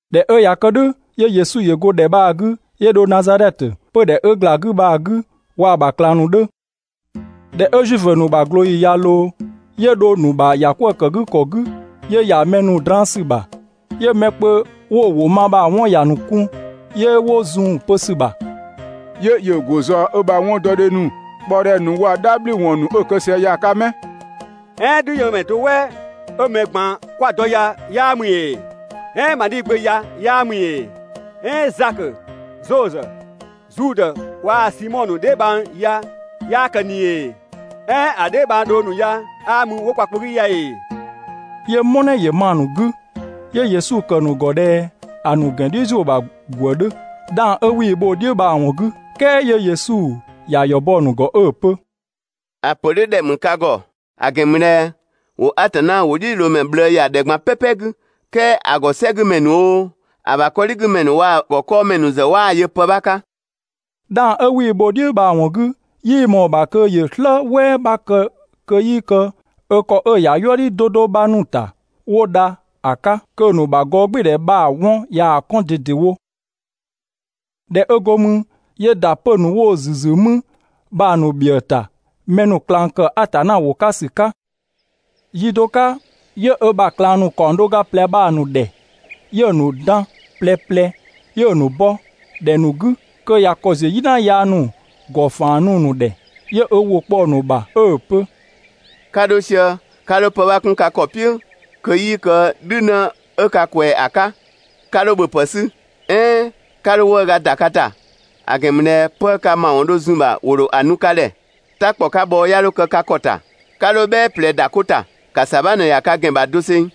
꞊Dhɛ 'ö ꞊ya kë "dhʋ̈, 'yö Yesu ‑yö go ‑dhɛ bha‑ 'gü, 'yö dho Nazadhɛtö, 'pödhɛ 'ö ‑gla 'gü bha‑ 'gü waa‑ ‑bha ꞊klang ‑nu 'dhö. ꞊Dhɛ 'ö Zuifö ‑nu ‑bha ꞊glooyi ꞊ya ꞊loo, 'yö dho‑ ‑nu ‑bha ‑yakwëëkëgükɔ 'gü 'yö ‑ya mɛ draan‑ ‑sü ‑bha. 'Yö mɛ kpö 'wo‑ ‑wʋ ma bha‑ 'wɔn ‑ya ‑nu kɔn, 'yö 'wo zun‑ pö ‑sü ‑bha: «'Yö ‑yö ‑go ꞊zɔɔ ö ‑bha 'wɔndɔdhe ‑nu, ꞊kpaɔdhɛ ‑nu waa‑ "dhabhliwɔn ‑nu 'ö‑ kë sië ya‑ 'ka 'mɛ? "Ɛɛn "dhüyënmɛ (do "wɛ 'ö mɛ ꞊gban 'kwa‑ dɔ ya) 'yaa ‑mü ‑ee? "Ɛɛn Madhi gbö ya 'yaa ‑mü ‑ee? "Ɛɛn Zakö, Zozö, Zudë waa‑ Simɔ ‑nu dheebhang ya 'yaa kë ꞊ni ‑ee? "Ɛɛn ‑a dheebhang dhong ‑nu ya 'aa mü 'wo kwa kpö 'gü ya ‑ee?» 'Yö "mɔnɛ ‑yö ma‑ ‑nu 'gü, 'yö Yesu ‑kë ‑nu ‑gɔ ꞊dhɛ ‑a ‑nu ‑gɛn "dhiʋ̈ ‑zuö ‑bha ‑gwë 'dhö ('dhang 'ö 'wii‑ bho‑ "dhiʋ̈ bha‑ ‑wɔn 'gü). "Kɛɛ 'yö Yesu ‑ya ‑yɔ bɔ‑ ‑nu ‑gɔ 'ö‑ pö: «‑A ‑pö "dhʋ̈ ‑dhɛ ‑mü ka ‑gɔ, ‑a ‑gɛn ‑mü ꞊dhɛ ‑wo Atanna ‑wʋdhiʋ̈loomɛ ꞊bhlëë ‑ya ‑dhɛ ꞊gban "pɛpɛ 'gü, "kɛɛ ‑a ‑gɔ "sɛgümɛ ‑nu oo, ‑a ‑bha 'kɔdhigümɛ ‑nu waa‑ ‑gɔ 'kɔɔmɛ ‑nu ‑zë 'waa‑ yö pë 'bha 'ka. 'Dhang 'ö 'wii‑ bho‑ "dhiʋ̈ bha‑ ‑wɔn 'gü, 'yii ꞊mɔɔ‑ ‑bha kö ‑yö "slë "wɛɛ 'bha kë kö 'yii kë ö ‑kɔ 'ö‑ ‑ya "yuëdhi 'do 'do 'bha ‑nu ‑ta, 'wo dha ‑a 'ka, kö‑ ‑nu ‑bha gɔɔgbɩɩdhɛ bha‑ 'wɔn ꞊yaa‑ 'kɔn ꞊dedewo. ꞊Dhɛ 'ö go mü, 'yö ‑da 'pö‑ ‑nu 'wo‑ ‑nu ‑züzü mü bha‑ ‑nu ‑bhiëë ‑ta mɛ ‑nu ꞊klang ‑kë Atanna ‑wʋ 'ka ‑sü 'ka. Yi do 'ka 'yö ö ‑bha ꞊klang ‑nu ‑kaɔng do ga ꞊plɛ bha‑ ‑nu ‑dhɛ, 'yö‑ ‑nu dan ꞊plɛ ꞊plɛ 'yö‑ ‑nu bɔ (‑dhɛ ‑nu 'gü) kö ꞊ya ‑kɔ ‑ziö "yina yaa ‑nu ‑gɔ ‑faan nu‑ ‑nu ‑dhɛ. 'Yö ö ‑wʋ kpɔ‑ ‑nu ‑bha 'ö‑ pö: «'Ka 'dho sië, 'ka 'dho pë 'bha 'kun ka ‑kɔ "piʋ̈ kö 'yii kë "dhünë 'ö ka ꞊kwɛɛ‑ ‑a 'ka. 'Ka 'dho ‑bhöpë 'sü, "ɛɛn 'ka 'dho 'wëëga ‑da ka ‑ta (‑a ‑gɛn ‑mü ꞊dhɛ 'pë ka ‑mawɔn dho zun‑ ‑bha ‑wo ‑dho ‑a nu ka ‑dhɛ). "Ta ‑kpɔ 'ka bhɔɔ 'ya 'dho kë ka ‑ta, 'ka 'dho "bhɛɛ ꞊plɛ ‑da 'ko ‑ta, ‑ka ‑sabha ꞊në ‑ya ka ‑gɛn ‑bha doseng.»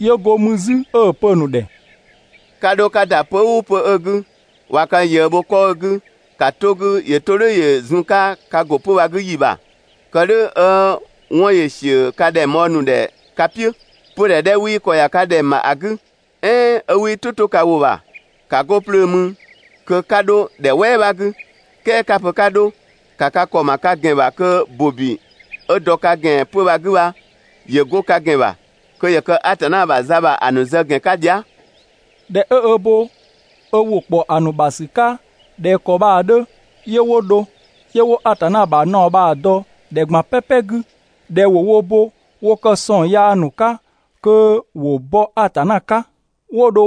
'Yö go mü 'zü 'ö‑ pö‑ ‑nu ‑dhɛ: «'Ka 'dho 'ka ‑da 'pö‑ "ʋʋ 'pö‑ 'ö‑ 'gü, ꞊wa ka ꞊yëë bho 'kɔ 'ö‑ 'gü, ‑ka 'to‑ 'gü ‑yö 'to "dhʋ̈ ‑yö zun‑ 'ka ka ‑go 'pö‑ bha‑ 'gü ‑yi ‑bha (kë "dhʋ̈ 'ö 'wɔn ‑yö ‑siö ka ‑dhɛngbhɔɔ ‑nu ‑dhɛ ka "piʋ̈). 'Pödhɛ 'dhɛ 'wii ‑kɔ ‑ya ka ‑dhɛng ‑bha ‑a 'gü, "ɛɛn 'ö 'wii "tʋ 'to ka ‑wʋ ‑bha, ‑ka 'go 'plöö mü kö 'ka 'dho ‑dhɛ "wɛɛ 'bha 'gü, "kɛɛ 'ka‑ pö 'ka 'dho, ‑ka ka ‑kɔ ‑ma ka ‑gɛn ‑bha kö ‑bobi 'ö ‑dɔ ka ‑gɛn ‑bha 'pö‑ bha‑ 'gü bha, ‑yö 'go ka ‑gɛn ‑bha, kö ‑yö kë Atanna ‑bha za ‑bha ‑a ‑nu zë ‑gɛn 'ka dhia".» ꞊Dhɛ 'ö ö bo ‑wʋ ‑kpɔ ‑a ‑nu ‑bha ‑sü 'ka ꞊dhɛ ‑kɔ bha‑ 'dhö, 'yö 'wo dho, 'yö 'wo Atanna ‑bha naɔ bha‑ dɔ ‑dhɛ ꞊gban "pɛpɛ 'gü ꞊dhɛ ‑wo wo bo wo kë ‑sɔng yaa ‑nu 'ka kö ‑wo bɔ Atanna 'ka. 'Wo dho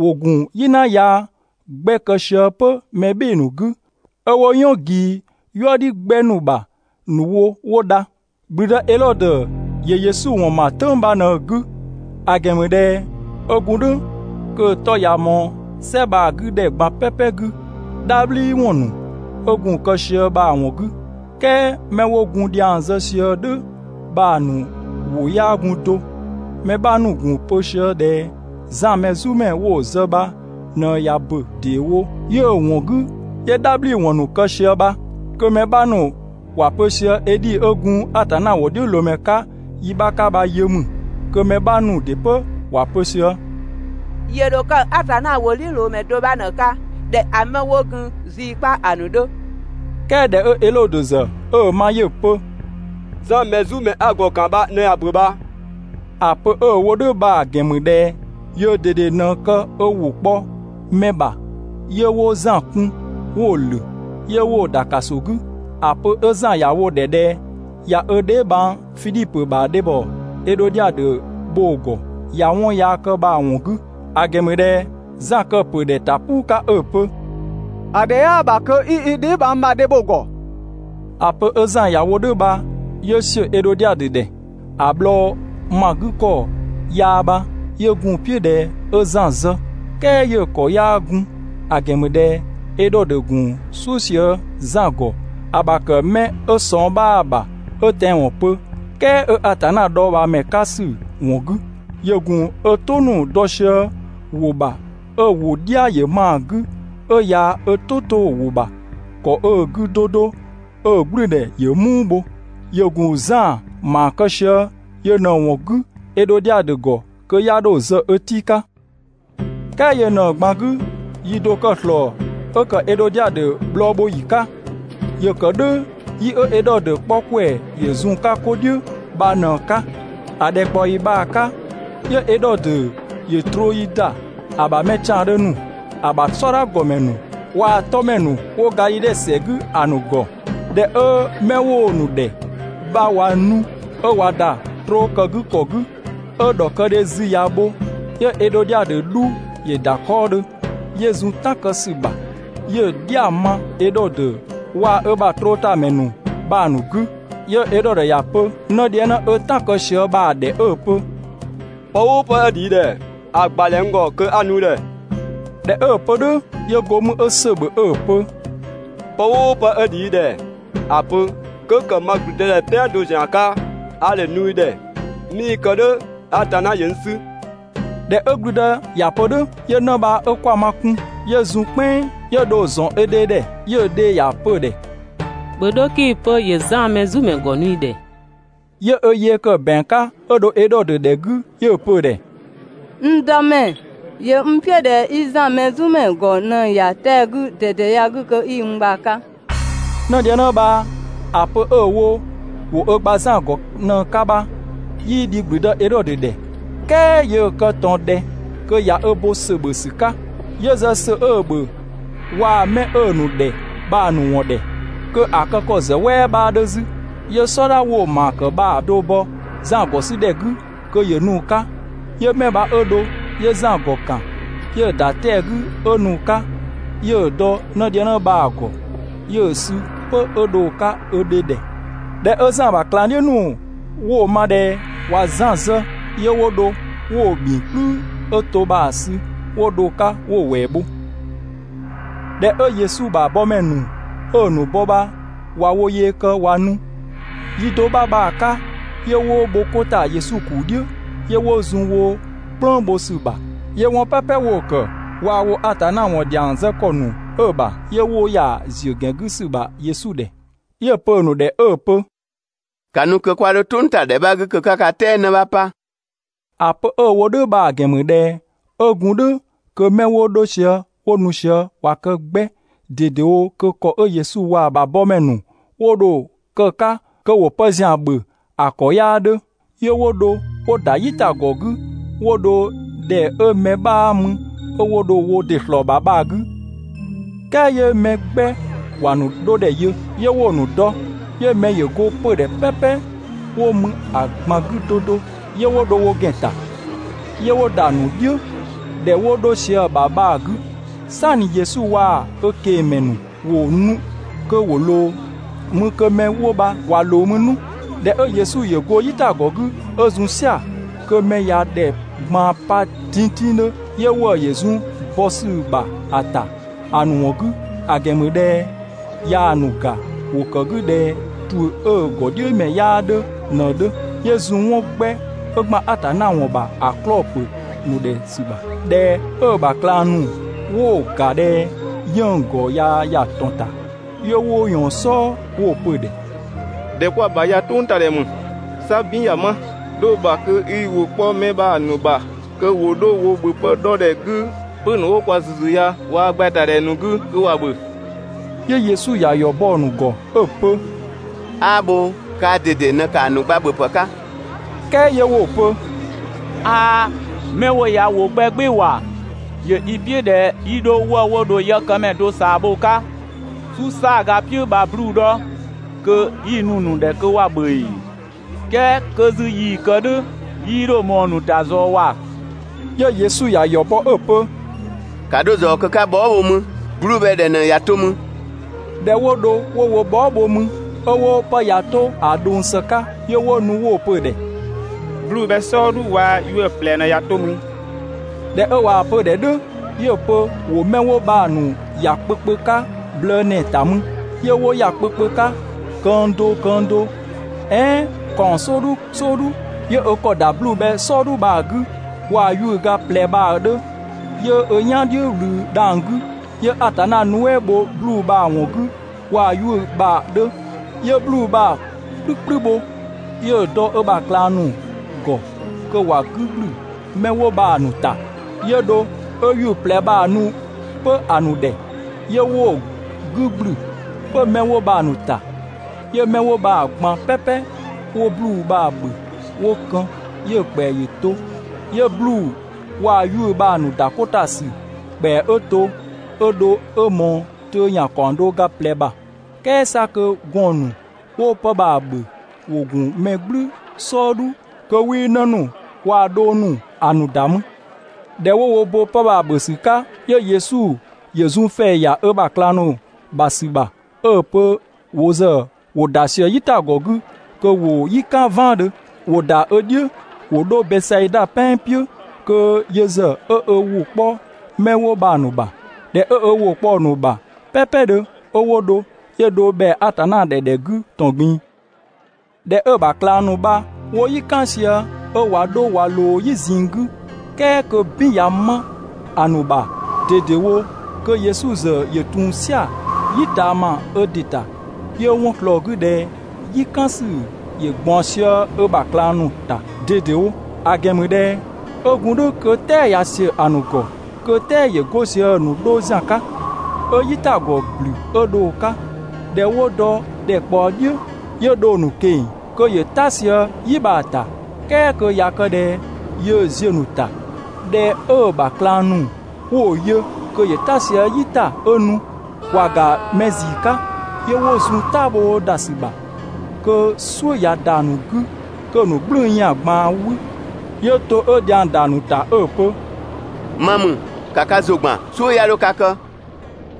‑wo ‑gun "yina yaa 'gbɛ kë sië 'pö mɛ "bhɩɩ‑ ‑nu 'gü, 'ö 'wo "yɔn ꞊gii "yuëdhi 'gbɛ ‑nu ‑bha ‑nu wo 'wo dha. ‑Gblüdë Edhodö ‑yö Yesu ‑wɔn ‑ma "tʋ̈ng bha ꞊në‑ 'gü, ‑a ‑gɛn ‑mü ꞊dhɛ 'ö gun "dhʋ̈ kö‑ 'tɔ ꞊ya ꞊mɔɔ "sɛ bha‑ 'gü ‑dhɛ ꞊gban "pɛpɛ 'gü ("dhabhliwɔn ‑nu 'ö gun‑ kë sië bha‑ ‑wɔn 'gü), "kɛɛ 'mɛ 'wo gun‑ ‑dhiang zë sië "dhʋ̈ bha‑ ‑nu ‑wʋ 'yaa gun do. Mɛ 'bha ‑nu ‑gun pö sië ꞊dhɛ Zan Mɛzumɛ 'wo‑ zë bha ꞊në ꞊ya ‑bö ‑deewo, 'yö‑ ‑wɔn 'gü 'yö "dhabhliwɔn ‑nu kë sië bha. Kö mɛ 'bha ‑nu ‑wa pö sië Edhi ('ö gun Atanna ‑wʋdhiʋ̈loomɛ 'ka yi 'bha 'ka bha yö ‑mü). Kö mɛ 'bha ‑nu ‑dɩ 'pö ‑wa pö sië: «‑Yö ‑dho kë Atanna ‑wʋdhiʋ̈loomɛ do 'bha ꞊në‑ 'ka ꞊dhɛ ‑a 'mɛ 'wo gun zii 'kpa ‑a ‑nu 'dhö.» "Kɛɛ ꞊dhɛ Edhodö ‑zë 'ö‑ ma, 'yö‑ pö: «Zan Mɛzumɛ 'a‑ ‑gɔ ‑kan bha ꞊në ꞊ya ‑bö bha!» ‑A pö 'ö‑ wo "dhʋ̈ bha‑ ‑gɛn ‑mü ꞊dhɛ yöö ꞊dede ꞊në kë ö ‑wʋ kpɔ mɛ ‑bha, 'yö 'wo Zan kun 'wo‑ ‑lö, 'yö 'wo‑ ‑da ‑kaso 'gü, ‑a pö 'ö Zan ‑ya wo‑ ‑dhɛ ꞊dhɛ ꞊ya ö dheebhang Fidhipö ‑bha dhebhɔ Edhodiadö bho‑ ‑gɔ ꞊ya 'wɔn yaa kë bha‑ ‑wɔn 'gü. ‑A ‑gɛn ‑mü ꞊dhɛ Zan‑ kë‑ ‑pö ‑dhɛ ‑ta "puu 'ka 'ö‑ pö: «‑A ‑dhɛ 'yaa ‑bha kö 'i i dheebhang ‑bha dhe bho‑ ‑gɔ.» ‑A pö 'ö Zan ‑ya wo "dhʋ̈ bha 'yö ‑siö Edhodiadö ‑dhɛ. ‑A bhlɔɔ ‑ma 'gü ‑kɔ yaa bha, 'yö gun "piʋ̈ ꞊dhɛ 'ö Zan zë, "kɛɛ 'yö‑ ‑kɔ 'yaa gun, ‑a ‑gɛn ‑mü ꞊dhɛ Edhodö ‑gun "suʋ̈ sië Zan ‑gɔ ‑a ‑bha ‑kë mɛ 'ö ꞊sɔng 'bhaa‑ ‑bha 'ö tɛanwɔn pö, "kɛɛ 'ö Atanna dhɔɔbhaamɛ 'ka ‑sü ‑wɔn 'gü. ‑Yö ‑gun ö "tʋ ‑nu dɔ sië‑ ‑wʋ ‑bha 'ö‑ ‑wʋ "dhia ‑yö ma‑ 'gü, 'ö ꞊ya ö "tʋ 'to‑ ‑wʋ ‑bha ‑kɔ 'ö‑ 'gü 'do 'do, 'ö‑ "gblʋ̈ʋ̈dhɛ ‑yö "muu bho, ‑yö ‑gun Zan ‑maa kë sië yö ꞊në‑ ‑wɔn 'gü Edhodiadö ‑gɔ kö 'ya 'dho‑ zë ö tii' 'ka. "Kɛɛ yö ꞊në‑ ꞊gban 'gü, yi do‑ kë ‑slɔɔ 'ö ‑kë Edhodiadö bhlɔɔ bho ‑yi 'ka. ‑Yö ‑kë "dhʋ̈ yi 'ö Edhodö 'kpɔ ‑kwɛ ‑yö zun‑ 'ka 'ko "dhiʋ̈ bha ꞊në‑ 'ka. ‑A ‑dhɛkpaɔyi bha‑ 'ka, 'yö Edhodö ‑yö trooyi ‑da ‑a ‑bha mɛ ‑tiandhö ‑nu, ‑a ‑bha "sɔdha ‑gɔmɛ ‑nu waa‑ 'tɔmɛ ‑nu 'wo Gadhidhe ‑sɛ 'gü ‑a ‑nu ‑gɔ. ꞊Dhɛ 'ö 'mɛ 'wo‑ ‑nu ‑dhɛ bha ꞊wa nu, 'ö ꞊wa ‑da trookëgükɔ 'gü, 'ö ‑dhɔkëdhe zü ꞊ya bho, 'yö Edhodiadö 'dhu ‑yö ‑da 'kɔɔdhö, 'yö zun "tan kë ‑sü ‑bha, 'yö‑ "dhia ‑yö ma Edhodö waa‑ ö ‑bha trootamɛ ‑nu bha‑ ‑nu 'gü. 'Yö Edhodö ‑ya pö 'nëdhiëngnë 'ö "tan kë sië bha‑ ‑dhɛ 'ö‑ pö: «Pë "ʋʋ pë 'ö ‑dhi i ‑dhɛ, ‑a ‑gbadhɛ n ‑gɔ kö 'a‑ nu i ‑dhɛ!» ꞊Dhɛ 'ö‑ pö "dhʋ̈, 'yö go mü 'ö ‑sö ‑bhö 'ö‑ pö: «Pë "ʋʋ pë 'ö ‑dhi i ‑dhɛ, ‑a pö, 'kö ‑kë ma ‑gblüdëdhɛ "pɛan do ‑zian 'ka, a ‑dho ‑a nu i ‑dhɛ. ('Mii‑ kë "dhʋ̈, Atanna ‑yö n 'sü).» ꞊Dhɛ 'ö ‑gblüdë ‑ya pö "dhʋ̈, 'yö 'në bha 'ö 'kwama kun, 'yö zun "kpɛnng 'yö dho‑ ‑zɔn ö dhe ‑dhɛ, 'yö‑ dhe ‑ya pö‑ ‑dhɛ: «‑Bhö 'dho 'kii‑ pö ‑yö Zan Mɛzumɛ ‑gɔ nu i ‑dhɛ!» 'Yö ö yee kë ‑bɛang 'ka 'ö dho Edhodö ‑dhɛ 'gü 'yö‑ pö‑ ‑dhɛ: «N dëmɛ, ‑yö n "piʋ̈ ꞊dhɛ 'i Zan Mɛzumɛ ‑gɔ ꞊në‑ ‑ya 'tɛa‑ 'gü ꞊dede ya‑ 'gü kö 'i n gba‑ 'ka.» 'Nëdhiëngnë bha‑ pö 'ö‑ wo ‑wo ö gba Zan ‑gɔ ꞊në‑ 'ka bha, 'yii dhi ‑gblüdë Edhodö ‑dhɛ, "kɛɛ yöö kë ꞊tɔn ꞊dhɛ kö ꞊ya ö bo ‑sö ‑bhö ‑sü 'ka. 'Yö zë ‑sö 'ö‑ ‑bhö waa‑ 'mɛ 'ö‑ ‑nu ‑dhɛ bha‑ ‑nu ‑wɔn ‑dhɛ, kö ‑a kë ‑kɔ ‑zë "wɛɛ 'bhaa 'dhö 'zü, 'yö "sɔdha 'wo‑ ‑maa kë bha‑ do bɔ Zan ‑gɔ 'sü ‑dhɛ 'gü kö ‑yö nu‑ 'ka. 'Yö 'mɛ bha 'ö dho, 'yö Zan ‑gɔ ‑kan, 'yö‑ ‑da 'tɛa‑ 'gü 'ö nu‑ 'ka, 'yö‑ dɔ 'nëdhiëngnë bha‑ ‑gɔ, 'yö‑ sü 'pö 'ö dho‑ 'ka ö dhe ‑dhɛ. ꞊Dhɛ 'ö Zan ‑bha ꞊klangdhiʋ̈ ‑nu 'wo‑ ma ꞊dhɛ ꞊wa Zan zë, 'yö 'wo dho 'wo‑ bhingkplü 'ö to bha‑ sü 'wo dho‑ 'ka 'wo‑ ‑wɛɛ bho. ꞊Dhɛ 'ö Yesu ‑bha bɔmɛ ‑nu 'ö‑ ‑nu bɔ bha, ꞊wa wo yee kë ꞊wa nu, yi do 'bha bha‑ 'ka 'yö 'wo bho 'ko ‑ta Yesu ‑kuu "dhiʋ̈, 'yö 'wo zun 'wo "kplëng bho ‑sü ‑bha. 'Yö 'wɔn "pɛpɛ 'wo‑ ‑kë, waa‑ 'wo Atanna ‑wɔn ‑dhiang zë ‑kɔ ‑nu 'ö‑ ‑bha, 'yö 'wo ‑ya ‑ziö ‑gɛn 'gü ‑sü ‑bha Yesu ‑dhɛ. 'Yö‑ ‑ya pö‑ ‑nu ‑dhɛ 'ö‑ pö: «‑Ka nu kö 'kwa 'dho "tʋngtadhɛ 'bha 'gü kö 'ka ka "tɛɛ 'në 'bha 'pa.» ‑A pö 'ö‑ wo "dhʋ̈ bha‑ ‑gɛn ‑mü ꞊dhɛ 'ö gun "dhʋ̈ kö 'mɛ 'wo 'dho sië 'wo nu sië ꞊wa kë 'gbɛ ꞊dedewo kö ‑kɔ 'ö Yesu waa‑ ‑bha yëkëmɛ ‑nu 'wo dho‑ kë‑ 'ka kö ‑wo pë ‑zian ‑bhö ‑a ‑kɔ 'yaa 'dhö. 'Yö 'wo dho 'wo ‑da "yitagɔ 'gü 'wo dho ‑dhɛ 'ö mɛ 'bhaa mü 'ö 'wo dho wo ‑dɩ ‑slɔɔ ‑bha bha‑ 'gü. "Kɛɛ 'yö mɛ 'gbɛ ‑wa ‑nu 'dho ‑dhɛ yö, 'yö 'wo‑ ‑nu dɔ, 'yö mɛ ‑yö go 'pödhɛ "pɛpɛ 'wo mü ‑a ꞊gban 'gü 'do 'do, 'yö 'wo dho wo ‑gɛn ‑ta, 'yö 'wo ‑da ‑nu "dhiʋ̈ ‑dhɛ 'wo 'dho sië‑ ‑bha bha‑ 'gü. "Sanni Yesu waa‑ ö ꞊kengmɛ ‑nu ‑wo nu kö ‑wo ꞊loo mü kö 'mɛ 'wo bha ꞊wa ꞊loo mü 'nu. ꞊Dhɛ 'ö Yesu ‑yö go "yitagɔ 'gü 'ö zun "sia‑, kö mɛ ꞊ya ‑dhɛ ꞊gban pa tingtingdhö; 'yö ‑wëë ‑yö zun bɔ ‑sü ‑bha ‑a ‑ta ‑a ‑nu ‑wɔn 'gü, ‑a ‑gɛn ‑mü ꞊dhɛ ꞊yaa‑ ‑nu ‑ga, ‑wo ‑kë 'gü ꞊dhɛ ‑tuʋ̈ 'ö‑ ‑gɔdhiʋ̈mɛ 'yaa 'dhö ꞊në‑ 'dhö. 'Yö zun 'wɔn 'gbɛ 'ö ‑gban Atanna ‑wɔn ‑bha ‑a 'klɔɔ‑ ‑pö ‑nu ‑dhɛ ‑sü ‑bha. ꞊Dhɛ 'ö‑ ‑bha ꞊klang ‑nu 'wo‑ ‑ga ꞊dhɛ 'yënng‑ ‑gɔ ꞊ya ‑ya ‑tɔn ‑ta, 'yö 'wo ꞊yɔɔn‑ "sɔɔ 'wo‑ pö‑ ‑dhɛ: «‑Dhɛ 'kwa‑ ‑bha ya "tʋngtadhɛ ‑mü, 'sa "bin ꞊ya 'ma. 'Dho‑ ‑bha kö 'i ‑wʋ 'kpɔ 'mɛ bha‑ ‑nu ‑bha kö ‑wo 'dho wo ‑bhöpë 'dhɔ ‑dhɛ 'gü 'pö‑ ‑nu 'wo kwa ‑züzü ya waa‑ gbɛɛtadhɛ ‑nu 'gü kö ‑wa ‑bhö. 'Yö Yesu ‑ya ‑yɔ bɔ‑ ‑nu ‑gɔ 'ö‑ pö: «'Aa bhoo, kaa ꞊dede ꞊në ‑kaa ‑nu gba ‑bhöpë 'ka!» "Kɛɛ 'yö 'wo‑ pö: «'Aa, 'mɛ 'wo ya ‑wo 'gbɛ "gbɩɩ‑ ‑wa! ‑Yö i "piʋ̈ ꞊dhɛ 'yi 'dho 'wëë‑ 'wo dho yëkëmɛ do ꞊saa bho‑ 'ka "su "saaga "piʋ̈ bha‑ 'bluu‑ ‑dhɔ kö 'yi‑ nu‑ ‑nu ‑dhɛ kö ‑wa ‑bhö ‑ee? "Kɛɛ kö 'zü yii‑ kë "dhʋ̈ 'yii 'dho ꞊mɔɔ‑ ‑nu ‑ta zɔɔ ‑wa!» 'Yö Yesu ‑ya ‑yɔ bɔ 'ö‑ pö: «‑Ka 'dho ꞊zɔɔ kö 'ka ka bhɔɔ" bho mü, 'bluu‑ bhɛ ꞊dhɛ ꞊në ꞊ya 'to mü? ꞊Dhɛ 'wo dho 'wo wo bhɔɔ" bho mü 'ö 'wo 'pë ꞊ya 'to ‑a ꞊dhʋng ‑së 'ka, 'yö 'wo nu 'wo‑ pö‑ ‑dhɛ: «'Bluu‑ bhɛ "sɔɔdhu waa‑ 'yuʋ̈‑ ꞊plɛ ꞊në ꞊ya 'to mü.» ꞊Dhɛ 'ö ꞊waa‑ pö‑ ‑dhɛ "dhʋ̈, 'yö‑ pö ‑wo 'mɛ 'wo bha‑ ‑nu ‑ya kpö kpö 'ka blëë ‑nɛɛ ‑ta mü. 'Yö 'wo ‑ya kpö kpö 'ka, këng do këng do, "ɛɛn ‑kaɔng "sɔɔdhu "sɔɔdhu. 'Yö ö ‑kɔ ‑da 'bluu‑ bhɛ "sɔɔdhu bha‑ 'gü, waa‑ 'yuʋ̈‑ ga ꞊plɛ bha‑ 'dhö, 'yö ö "yan "dhiʋ̈ ꞊wlü dhang‑ 'gü, 'yö Atanna nuɛ" bho 'bluu‑ bha‑ ‑wɔn 'gü waa‑ 'yuʋ̈‑ bha‑ 'dhö, 'yö 'bluu‑ bha‑ "kplü "kplü bho, 'yö‑ dɔ ö ‑bha ꞊klang ‑nu ‑gɔ kö ‑wa 'gü ‑gblü 'mɛ 'wo bha‑ ‑nu ‑ta. 'Yö dho 'ö 'yuʋ̈‑ ꞊plɛ bha‑ nu 'pö‑ ‑nu ‑dhɛ, 'yö 'wo‑ 'gü ‑gblü 'pö 'mɛ 'wo bha‑ ‑nu ‑ta. 'Yö 'mɛ 'wo bha‑ ꞊gban "pɛpɛ 'wo 'bluu‑ bha‑ ‑bhö 'wo kën, 'yö‑ ‑kpɛa ‑yö to. 'Yö 'bluu‑ waa‑ 'yuʋ̈‑ bha‑ ‑nu ‑da 'ko ‑ta ‑sü ‑kpɛa 'ö to 'ö dho 'ö ꞊mɔɔ töö ‑yan ‑kaɔng do ga ꞊plɛ ‑bha, "kɛɛ 'sa kö gɔɔn‑ ‑nu 'wo 'pë bha‑ ‑bhö ‑wo gun mɛ "gblü "sɔɔdhu (kö 'wii 'në ‑nu waa‑ dhong ‑nu ‑a ‑nu ‑da mü). ꞊Dhɛ 'wo wo bo 'pë bha‑ ‑bhö ‑sü 'ka, 'yö Yesu ‑yö zun ‑fɛɛ ‑ya ö ‑bha ꞊klang ‑nu ‑bha ‑sü ‑bha 'ö‑ pö wo ‑zë ‑wo ‑da ꞊sië "yitagɔ 'gü kö ‑wo "yi "kan "vaandhö, ‑wo ‑da ö "dhiʋ̈ ‑wo 'dho Bɛsaida "pɛan "piʋ̈ kö yö ‑zë 'ö ö ‑wʋ 'kpɔ 'mɛ 'wo bha‑ ‑nu ‑bha. ꞊Dhɛ 'ö ö ‑wʋ kpɔ‑ ‑nu ‑bha "pɛpɛdhö, 'ö 'wo dho, 'yö dho ‑bhɛa Atanna ‑dhɛ ‑dhɛ 'gü ‑tɔn ꞊gbin‑. ꞊Dhɛ 'ö‑ ‑bha ꞊klang ‑nu bha 'wo "yi "kan sië 'ö ꞊wa 'dho ꞊wa ꞊loo "yi ꞊zinng 'gü, "kɛɛ kö "bin ꞊ya 'ma‑ ‑nu ‑bha ꞊dedewo, kö Yesu ‑zë ‑yö ‑tun "sia‑ "yi ꞊taama ö ‑dɩ ‑ta, 'yö 'wɔn ꞊slɔɔ‑ 'gü ꞊dhɛ "yi "kan ‑sü ‑yö ꞊gbaɔn sië ö ‑bha ꞊klang ‑nu ‑ta ꞊dedewo, ‑a ‑gɛn ‑mü ꞊dhɛ 'ö gun "dhʋ̈ kö "tɛɛ ꞊ya ‑siö ‑a ‑nu ‑gɔ, kö "tɛɛ ‑yö go sië‑ ‑nu 'dho ‑zian 'ka, 'ö "yitagɔ ‑blü 'ö dho‑ 'ka. ꞊Dhɛ 'wo dɔ ‑dhɛkpaɔ "dhiʋ̈, 'yö dho‑ ‑nu ꞊keng‑ kö ‑yö "ta sië "yi bha‑ ‑ta, "kɛɛ kö ꞊ya kë ꞊dhɛ yöö ziö‑ ‑nu ‑ta. ꞊Dhɛ 'ö‑ ‑bha ꞊klang ‑nu 'wo‑ yö kö ‑yö "ta sië "yi ‑ta 'ö nu, ‑wa ‑ga mɛ ‑zii 'ka, 'yö 'wo zun "tabhoo ‑da ‑sü ‑bha, kö "suʋ̈ ꞊ya ‑da ‑nu 'gü kö‑ ‑nu "gblʋ̈ʋ̈‑ ‑yan ꞊gbaan 'wü, 'yö to 'ö dhiang ‑da ‑nu ‑ta 'ö‑ pö: «Ma ‑mü, ‑ka ka ‑zʋ ‑gban, "suʋ̈ 'ya 'dho ka kë!»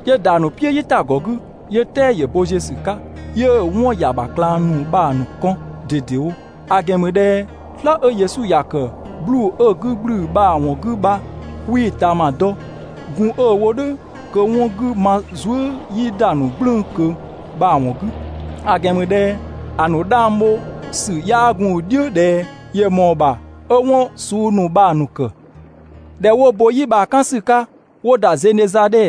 'Yö ‑da ‑nu "piʋ̈ "yitagɔ 'gü, 'yö "tɛɛ ‑yö bo ziö ‑sü 'ka, 'yö‑ 'wɔn ‑ya ‑bha ꞊klang ‑nu bha‑ ‑nu kɔn ꞊dedewo. ‑A ‑gɛn ‑mü ꞊dhɛ "slë 'ö Yesu ‑ya ‑kë 'bluu‑ 'ö‑ 'gü ‑gblü bha‑ ‑wɔn 'gü bha 'wii‑ ꞊taama dɔ, gun 'ö‑ wo "dhʋ̈ kö 'wɔn 'gü ma zuë" 'yii ‑da ‑nu "gblʋ̈ʋ̈‑ ꞊kö bha‑ ‑wɔn 'gü, (‑a ‑gɛn ‑mü ꞊dhɛ ‑a ‑nu 'dhang bho ‑sü 'yaa gun‑ "dhiʋ̈ ꞊dhɛ ‑yö ‑mɔɔ ‑bha 'ö 'wɔn suu ‑nu bha‑ ‑nu ‑kë). ꞊Dhɛ 'wo bo "yi bha‑ "kan ‑sü 'ka, 'wo ‑da Zenezadhe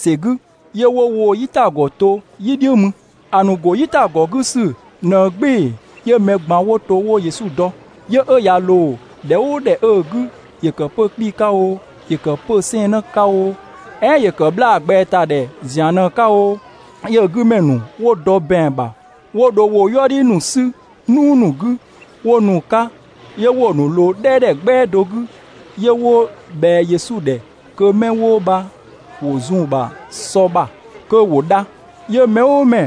‑sɛ 'gü, 'yö 'wo woo‑ "yitagɔ to "yi "dhiʋ̈ mü. ‑A ‑nu ‑go "yitagɔ 'gü ꞊në "gbɩɩ‑, 'yö mɛ ꞊gban 'wo to 'wo Yesu dɔ. 'Yö ꞊ya ꞊loo ‑dhɛ "ʋʋ ‑dhɛ 'ö‑ 'gü, ‑yö ‑kë 'pö‑ 'kpii‑ 'ka oo, ‑yö ‑kë 'pö‑ 'sɛɛnnë 'ka oo, "ɛɛn ‑yö ‑kë 'bhlaa ꞊gbɛatadhɛ ‑zian ꞊në‑ 'ka oo, 'yö‑ 'gü ‑mɛ ‑nu 'wo dɔ ‑bɛang ‑bha 'wo dho woo‑ "yuëdhi ‑nu 'sü "nuu ‑nu 'gü 'wo nu‑ 'ka, 'yö 'wo‑ ‑nu ꞊loo "dhɛɛdhɛ "gbɛa do 'gü, 'yö 'wo ꞊bhɛa Yesu ‑dhɛ kö 'mɛ 'wo bha ‑wo zun‑ ‑bha sɔ ‑bha (kö ‑wo dha). 'Yö mɛ "ʋʋ mɛ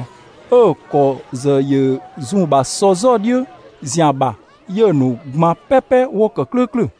'ö‑ ‑kɔ ‑zë ‑yö zun‑ ‑bha sɔ "zɔdhiʋ̈ ‑zian ‑bha, 'yö‑ ‑nu ꞊gban "pɛpɛ 'wo ‑kë "klʋ̈ʋ̈klʋ̈.